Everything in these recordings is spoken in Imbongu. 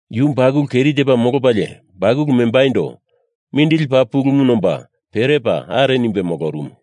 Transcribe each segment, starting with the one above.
Yu bakulu keri tepa molopalie bakulu membaindo mindili paa pulumu nomba perepa are nimbe molorumu.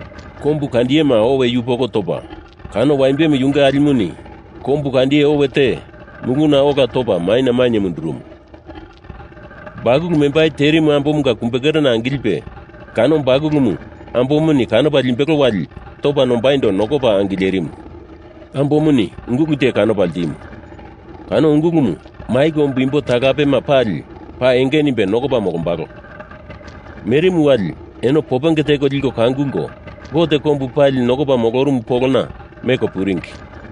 Kombu kandiyema owe yupoko topa, kano waimbemu yunge alimuni kombu kandiye owe te muluna ola topa maina mainye mundurumu. Bakulu membai terimu ambomunga kumbe kerena angilipe kano bakulumu ambomuni kanopa limbelo wali topa nombaindo nokopa angilerimu. Ambomuni ungulu te kanopa ltimu. Kano ungulumu mai kombu imbo talapema pali paa enge nimbe nokopa molombalo. Merimu wali eno popenge teko liko kangulko Gote kombu pali nokopa molorumu polona meko puringi.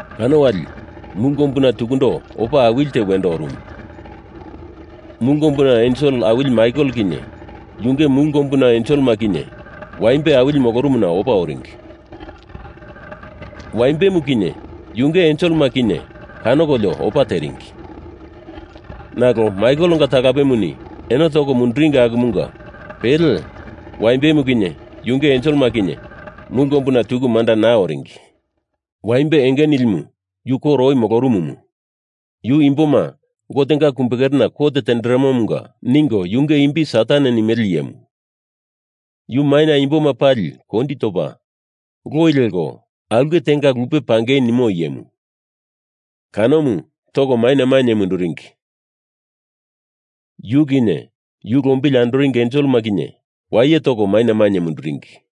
Kano wali mulu kombuna tukundo opa awili te wendo orumu. Mulu kombuna ensel awili Maikel kinye yunge mulu kombuna enselema kinye waimbe awili molorumuna opa oringi. Waimbemu kinye yunge enselema kinye kanokolio opa teringi nalo Maikelenga talapemuni eno toko munduringi akumunga pele Waimbemu kinye yunge enselema kinye mulu kombuna tuku manda naa moloringi. Waimbe enge nilimu yu koro oi molorumumu, yu imboma Gotenga kumbe kerena kot tenderemomunga ningo yunge imbi Satan nimele iyemu, yu maina imboma pali kondi topa loi leko aulke tenga lupe pangei nimo iyemu. Kanomu toko maina mainye munduringi, yu kinye yu lombili andoringi enselema kinye waye toko maina mainye munduringi.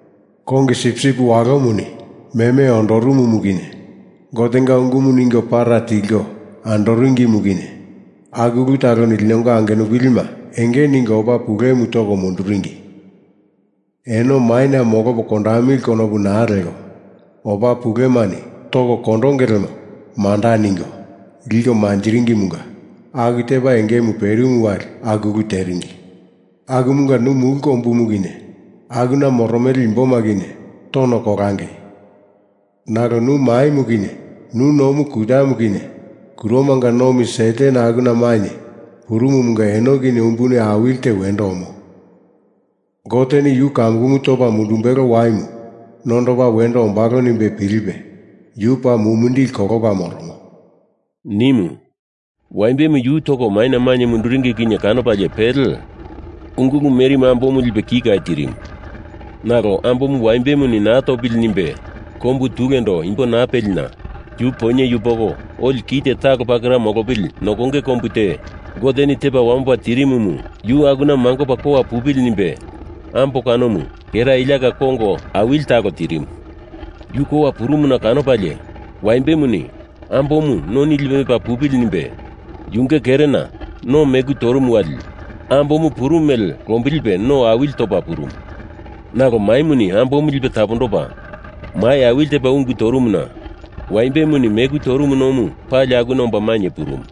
Kongi Sipsip Walomuni meme ondorumumu kinye Gotenga ungumu ningo para tilko andoringimu kinye aku ulu taloni linonga angenupilima enge ningo opa pulemu toko munduringi. Eno maina molopo kondamili konopu naa leko, opa pulemani toko kondonge lemo manda ningo liko manjiringimunga aku tepa engemu perimu wali aku ulu teringi. Akumunga nu mulu kombumu kinye akuna moromele imboma kinye tono kolangei! Nalo nu maimu kinye nu nomu kutamu kinye kuromanga nomi Satan akuna mainye purumumunga eno kinye umbuni awili te wendo omo. Goteni yu kamukumu topa mundumbelo waimu nondopa wendo ombalo nimbe pilipe yu paa mumindili kolopa moromo,” nimu. Waimbemu yu toko maina mainye munduringi kinye kanopalie pele ungulu merimu ambomu lipe kika tirimu. Nalo ambomu waimbemuni naa topili nimbe kombu tulendo imbo naa pelina yu poinye yupoko oli kite talo pakera molopili nokonge kombu te Goteni tepa wamopa terimumu yu akuna mangopa kowa pupili nimbe ambo kanomu kera iliaka kongo awili talo tirimu. Yu kowa purumuna kanopalie waimbemuni ambomu noni lipe mepa pupili nimbe yunge kerena no meku torumu wali ambomu purumu mele lombilipe no awili topa purumu. Nalo maimuni ambomu lipe tapondopa mai awili tepa ungu torumuna waimbemuni meku torumu nomu pali akuna omba mainye purumu.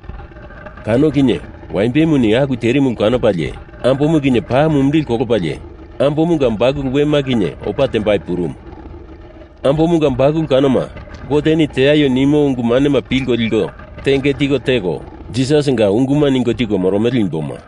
Kano kinye waimbemuni aku terimu ulu kanopalie ambomu kinye paa mumindili kolopalie ambomunga bakulu wema kinye opa tembai purumu. Ambomunga bakulu kanoma Goteni teaio nimo ungu manema pilko liko tenge tiko teko, Jisasinga unguma ningo tiko moromele imboma.